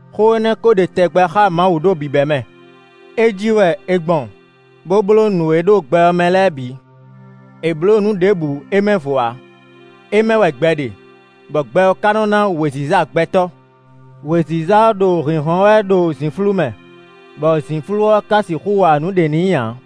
Xó énɛ́ kó ɖe tɛgbɛ xá Mawu ɖo bǐbɛ́mɛ. É jí wɛ è gbɔn bó bló nǔ e ɖo gbɛ ɔ́ mɛ lɛ́ɛ bǐ; è blǒ nǔ ɖěbǔ é mɛ vo ǎ. É mɛ wɛ gbɛ ɖe, bɔ gbɛ ɔ́ ka nɔ ná wěziza gbɛtɔ́. Wěziza ɔ́ ɖo hǐnhɔ́n wɛ ɖo zǐnflú mɛ, bɔ zǐnflú ɔ́ ka sixú wa nǔɖé n'i ǎ.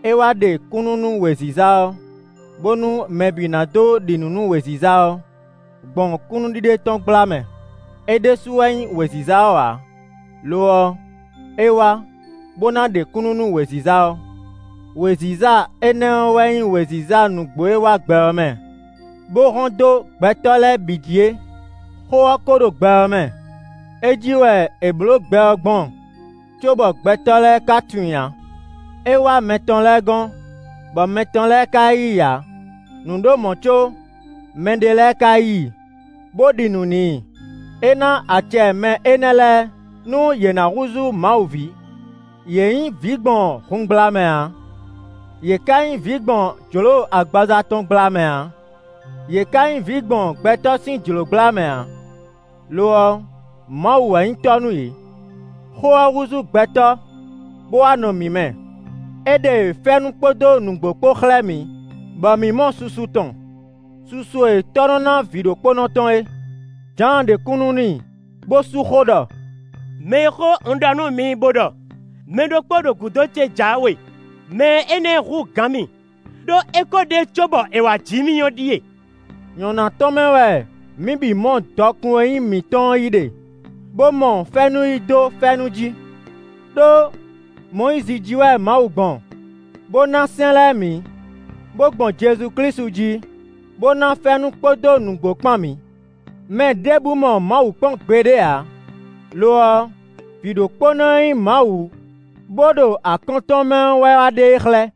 É wá ɖe kúnnu nú wěziza ɔ́, bónú mɛ bǐ ná dó ɖi nǔ nú wěziza ɔ́, gbɔn kúnnuɖiɖe tɔn gbla mɛ. É ɖésú wɛ nyí wěziza ɔ́ ǎ; lo ɔ́, é wá, bó ná ɖe kúnnu nú wěziza ɔ́. Wěziza énɛ́ ɔ́ wɛ nyí wěziza nǔgbó e wá gbɛ ɔ́ mɛ, bó hɔ́n dó gbɛtɔ́ lɛ́ɛ bǐ jí é. Xó ɔ́ kó ɖo gbɛ ɔ́ mɛ; é jí wɛ è blǒ gbɛ ɔ́ gbɔn cóbɔ gbɛtɔ́ lɛ́ɛ ka tunwun i ǎ. É wá mɛ tɔn lɛ́ɛ gɔ́n, bɔ mɛ tɔn lɛ́ɛ ka yí i ǎ. Nǔ ɖo mɔ̌ có mɛɖé lɛ́ɛ ka yí i, bó ɖi nǔ n'i. É ná acɛ mɛ énɛ́ lɛ́ɛ, nú yě ná húzú Mawu ví. Yě nyí vǐ gbɔn hun gbla mɛ ǎ; yě ká nyí vǐ gbɔn jlǒ agbaza tɔn gbla mɛ ǎ; yě ká nyí vǐ gbɔn gbɛtɔ́ sín jlǒ gbla mɛ ǎ; lo ɔ́, Mawu wɛ nyí Tɔ́ nú yě. Xó ɔ́ húzú gbɛtɔ́, bó wá nɔ mǐ mɛ; é ɖe fɛ́nú kpódó nǔgbó kpó xlɛ́ mǐ, bɔ mǐ mɔ susu tɔn, susu e Tɔ́ nɔ ná Vǐɖokpónɔ tɔn é. Jǎan ɖe kúnnu n'i, bó sú xó ɖɔ: “Mɛ e xó un ɖɔ nú mi bó ɖɔ: ‘Mɛ ɖokpó ɖo gǔdo ce jǎwe; mɛ énɛ́ hú gǎn mì, ɖó é kó ɖe cóbɔ è wǎ ji mì’ ɔ́ ɖíe.” Nyɔ̌ná tɔn mɛ wɛ mǐ bǐ mɔ dɔkun e nyí mǐtɔn ɔ́ yí ɖe, bó mɔ fɛ́nú yí dó fɛ́nú jí. Đó Mɔyízi jí wɛ Mawu gbɔn, bó ná sɛ́n lɛ́ɛ mǐ, bó gbɔn Jezu Klísu jí, bó ná fɛ́nú kpódó nǔgbó kpán mǐ. Mɛ ɖěbǔ mɔ Mawu kpɔ́n gbeɖé ǎ; lo ɔ́, Vǐɖokpónɔ e nyí Mawu bó ɖo akɔ́n tɔn mɛ ɔ́ wɛ wá ɖe e xlɛ́.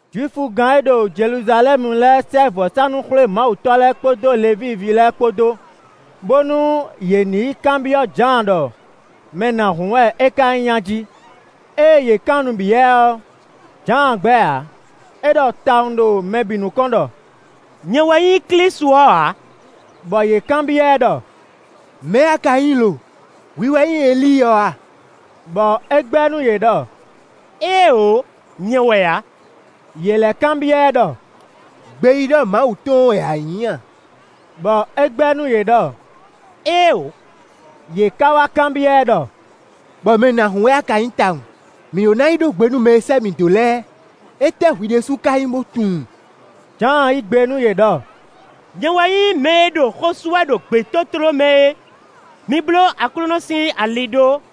Jwifugán e ɖo Jeluzalɛ́mu lɛ́ɛ sɛ́ vɔ̌sánú-xwlémawutɔ́ lɛ́ɛ kpódó Levíi ví lɛ́ɛ kpó dó, bónú yě ní yi kanbyɔ́ Jǎan ɖɔ mɛ nǎhún wɛ é ka nyí a jí. Ée yě kan nǔ byɔ́ ɛ ɔ́, Jǎan gbɛ́ ǎ; é ɖɔ tawun ɖo mɛ bǐ nukɔn ɖɔ: “Nyɛ wɛ nyí Klísu ɔ́ ǎ.” Bɔ yě kanbyɔ́ ɛ ɖɔ: “Mɛ̌ wɛ a ka nyí lo? Hwi wɛ nyí Elíi ɔ́ a?” Bɔ é gbɛ́ nú yě ɖɔ: “Éeǒ, nyɛ wɛ ǎ.” Yě lɛ́ kanbyɔ́ ɛ ɖɔ: “Gbeyíɖɔ Mawu tɔn ɔ́ wɛ a nyí a?” Bɔ é gbɛ́ nú yě ɖɔ: “Éeǒ.” Yě ká wá kanbyɔ́ ɛ ɖɔ: “Bɔ mɛ nǎhún a ka nyí tawun? Mǐ ɖó ná yi ɖó gbe nú mɛ e sɛ́ mǐ dó lɛ́ɛ; étɛ́ hwi ɖésú ká nyí bó tunwun?” Jǎan yí gbe nú yě ɖɔ: “Nyɛ wɛ nyí mɛ e ɖo xó sú wɛ ɖo gbětótló mɛ é: ‘Mi bló Aklúnɔ sín ali ɖó.’”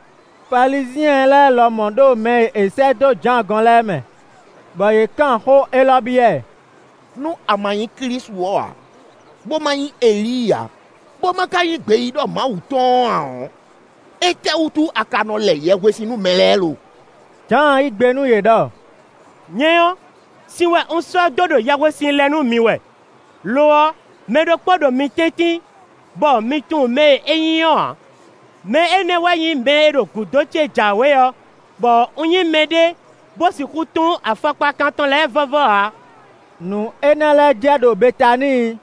Falizyɛn lɛ́ɛ lɔmɔ̌ ɖo mɛ e è sɛ́ dó Jǎan gɔ́n lɛ́ɛ mɛ. Bɔ yě kan xó élɔ́ byɔ́ ɛ: “Nú a ma nyí Klísu ɔ́ ǎ, bó ma nyí Elíi ǎ, bó ma ka nyí gbeyíɖɔ Mawu tɔn ɔ́ ǎ ɔ́, étɛ́wútu a ka nɔ lɛ yɛhwesin nú mɛ lɛ́ɛ lo?” Jǎan yí gbe nú yě ɖɔ: “Nyɛ ɔ́, sin wɛ un sɔ́ dó ɖo yɛhwesin lɛ nú mi wɛ; lo ɔ́, mɛ ɖokpó ɖo mi tɛ́ntin, bɔ mi tunwun mɛ e é nyí ɔ́ ǎ. Mɛ énɛ́ wɛ nyí mɛ e ɖo gǔdo ce jǎwe ɔ́, bɔ un nyí mɛɖé bó sixú tún afɔkpakan tɔn lɛ́ɛ vɔ́vɔ́ ǎ.” Nǔ énɛ́ lɛ́ɛ jɛ ɖo Betaníi,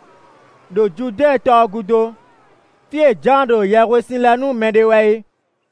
ɖo Judɛ́ɛn tɔ ɔ́ gúdo, fí e Jǎan ɖo yɛhwesin lɛ nú mɛ ɖe wɛ é.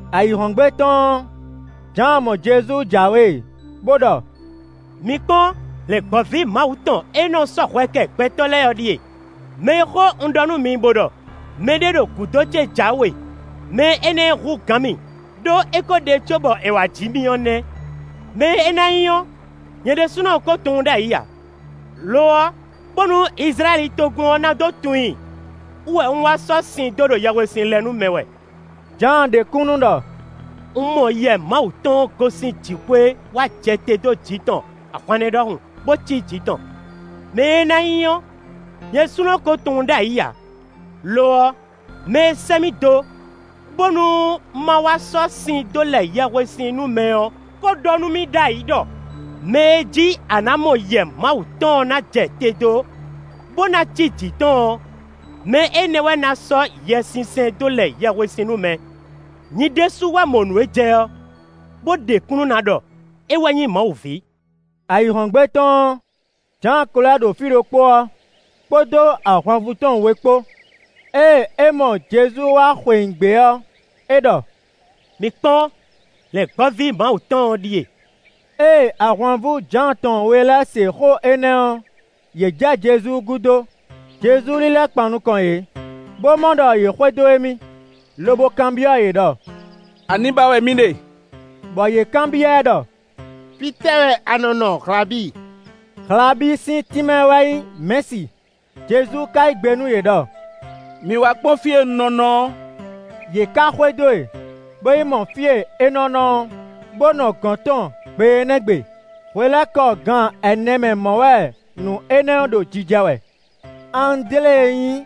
Ayǐhɔ́ngbe tɔn ɔ́, Jǎan mɔ Jezu jǎwe bó ɖɔ: “Mi kpɔ́n! Lɛ̌ngbɔ́ví Mawu tɔn e nɔ sɔ́ hwɛ kɛ gbɛtɔ́ lɛ́ɛ ɔ́ ɖíe. Mɛ e xó un ɖɔ nú mi bo ɖɔ: ‘Mɛ ɖé ɖo gǔdo ce jǎwe; mɛ énɛ́ hú gǎn mì, ɖó é ko ɖe cóbɔ è wá ji mì ɔ́ nɛ́.’ Mɛ e é ná nyí ɔ́, nyɛ ɖésúnɔ ko tunwun ɖ'ayǐ ǎ; lo ɔ́, bónú Izlayɛ́li togun ɔ́ ná dó tunwun i wú wɛ un wá sɔ́ sin dó ɖo yɛhwesin lɛ nú mɛ wɛ.” Jǎan ɖe kúnnu ɖɔ: “Un mɔ Yɛ Mawu tɔn gosín jǐxwé wá jɛ te dó jǐ tɔn ahwannɛ́ ɖɔhun, bó cí jǐ tɔn. Mɛ e é ná nyí ɔ́, nyɛ ɖésúnɔ ko tunwun ɖ'ayǐ ǎ. Lo ɔ́, mɛ e sɛ́ mì dó, bónú má wá sɔ́ sin dó lɛ yɛhwesin nú mɛ ɔ́, ko ɖɔ nú mì ɖ'ayǐ ɖɔ: ‘Mɛ e jí a nǎ mɔ Yɛ Mawu tɔn ná jɛ te dó, bó ná cí jǐ tɔn ɔ́, mɛ énɛ́ wɛ ná sɔ́ Yɛsinsɛn dó lɛ yɛhwesin nú mɛ.’ Nyi ɖésú wɛ mɔ nǔ e jɛ ɔ́, bó ɖe kúnnu ná ɖɔ é wɛ nyí Mawu ví.” Ayǐhɔ́ngbe tɔn ɔ́, Jǎan ko lɛ́ ɖo fí ɖokpó ɔ́, kpódó ahwanvú tɔn we kpó. Ée é mɔ Jezu wá xweyǐgbe ɔ́, é ɖɔ: “Mi kpɔ́n! Lɛ̌ngbɔ́ví Mawu tɔn ɔ́ ɖíe.” Ée ahwanvú Jǎan tɔn we lɛ́ɛ se xó énɛ́ ɔ́, yě jɛ Jezu gúdo. Jezu lílɛ́ kpan nukɔn yě, bó mɔ ɖɔ yě xwedó émí, lobo kanbyɔ́ yě ɖɔ: “Ani ba wɛ mi ɖe?” Bɔ yě kanbyɔ́ ɛ ɖɔ: “Fítɛ́ wɛ a nɔ́ nɔ, Hlabi?” Hlabi sín tínmɛ wɛ nyǐ Mɛ̌si. Jezu ka yí gbe nú yě ɖɔ: “Mi wá kpɔ́n fí e un nɔ nɔ ɔ́.” Yě ká xwedó e, bo yi mɔ fí e é nɔ́ nɔ ɔ́, bó nɔ gɔ̌n tɔn gbe énɛ́ gbe. (Hwelɛ́kɔ gan ɛnɛ mɛ mɔ̌ wɛ nǔ énɛ́ ɔ́ ɖo jijɛ wɛ.) Andlé e nyí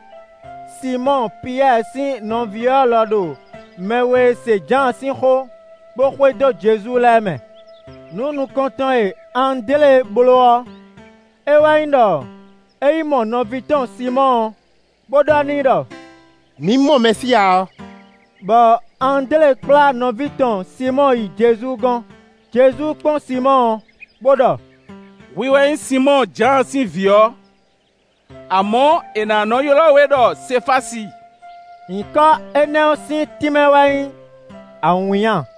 Sinmɔ́ɔ Piyɛ́ɛ sín nɔví ɔ́ lɔ ɖo mɛ we e se Jǎan sín xó, bo xwedó Jezu lɛ́ɛ mɛ. Nǔ nukɔntɔn e Andlé bló ɔ́, é wɛ nyí ɖɔ é yi mɔ nɔví tɔn Sinmɔ́ɔ, bo ɖɔ n'i ɖɔ: “Mǐ mɔ Mɛsíya ɔ́.” Bɔ Andlé kplá nɔví tɔn Sinmɔ́ɔ yi Jezu gɔ́n. Jezu kpɔ́n Sinmɔ́ɔ, bó ɖɔ: “Hwi wɛ nyí Sinmɔ́ɔ, Jǎan sín vǐ ɔ́; amɔ̌, è nǎ nɔ ylɔ́ we ɖɔ Sefási (nyǐkɔ énɛ́ ɔ́ sín tínmɛ wɛ nyí awǐnnya.)”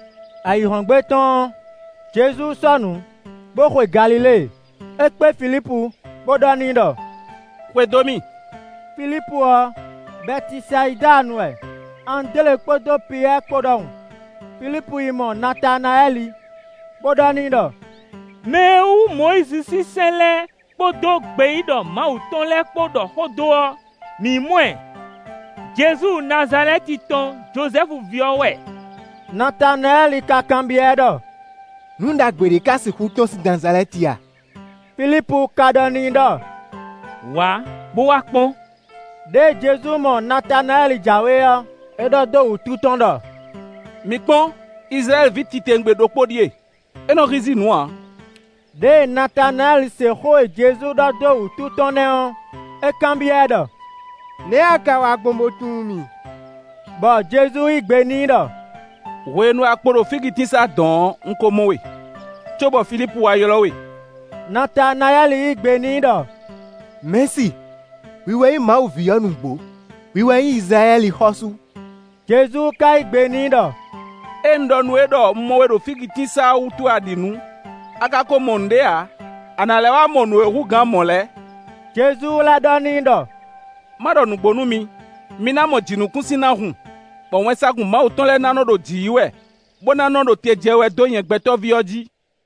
Ayǐhɔ́ngbe tɔn ɔ́, Jezu sɔ́ nǔ, bó xwe Galilée. É kpé Filípu, bó ɖɔ n'i ɖɔ: “Xwedó mì!” (Filípu ɔ́, Bɛtisayidanu wɛ, Andlé kpódó Piyɛ́ɛ kpó ɖɔhun.) Filípu yi mɔ Natanayɛ́li, bó ɖɔ n'i ɖɔ: “Mɛ e wú Mɔyízi sín sɛ́n lɛ́ɛ kpódó gbeyíɖɔ Mawu tɔn lɛ́ɛ kpó ɖɔ xó dó ɔ́, mǐ mɔ ɛ. Jezu Nazalɛ́ti tɔn Jozɛ́fu ví ɔ́ wɛ.” Natanayɛ́li ka kanbyɔ́ ɛ ɖɔ: “Nǔ ɖagbe ɖě ká sixú tɔ́n sín Nazalɛ́ti a?” Filípu ka ɖɔ n'i ɖɔ: “Wǎ, bó wá kpɔ́n.” Đěe Jezu mɔ Natanayɛ́li jǎwe ɔ́, é ɖɔ dó wútu tɔn ɖɔ: “Mi kpɔ́n! Izlayɛ́li ví titewungbe ɖokpó ɖíe; é nɔ hízí nǔ ǎ.” Đěe Natanayɛ́li se xó e Jezu ɖɔ dó wútu tɔn nɛ́ ɔ́, é kanbyɔ́ ɛ ɖɔ: “Nɛ̌ a ka wa gbɔn bó tunwun mì?” Bɔ Jezu yí gbe n'i ɖɔ: “Hwenu e a kpo ɖo fígitínsá dɔ̌n ɔ́, un ko mɔ we, cóbɔ Filípu wá ylɔ́ we.” Natanayɛ́li yí gbe n'i ɖɔ: “Mɛ̌si, hwi wɛ nyí Mawu ví ɔ́ nǔgbó; hwi wɛ nyí Izlayɛ́li xɔ́sú.” Jezu ka yí gbe n'i ɖɔ: “Ée un ɖɔ nú we ɖɔ un mɔ we ɖo fígitínsá ɔ́ wútu wɛ a ɖi nǔ; a ka ko mɔ nǔɖé ǎ; a nǎ lɛ́ wá mɔ nǔ e hú gǎn mɔ̌ lɛ́ɛ.” Jezu lɛ́ ɖɔ n'i ɖɔ: “Ma ɖɔ nǔgbó nú mi: mi ná mɔ jǐnukúnsin ná hun, bɔ wɛnsagun Mawu tɔn lɛ́ɛ ná nɔ ɖo jǐ yi wɛ, bó ná nɔ ɖo te jɛ wɛ dó nyɛ Gbɛtɔ́ví ɔ́ jí.”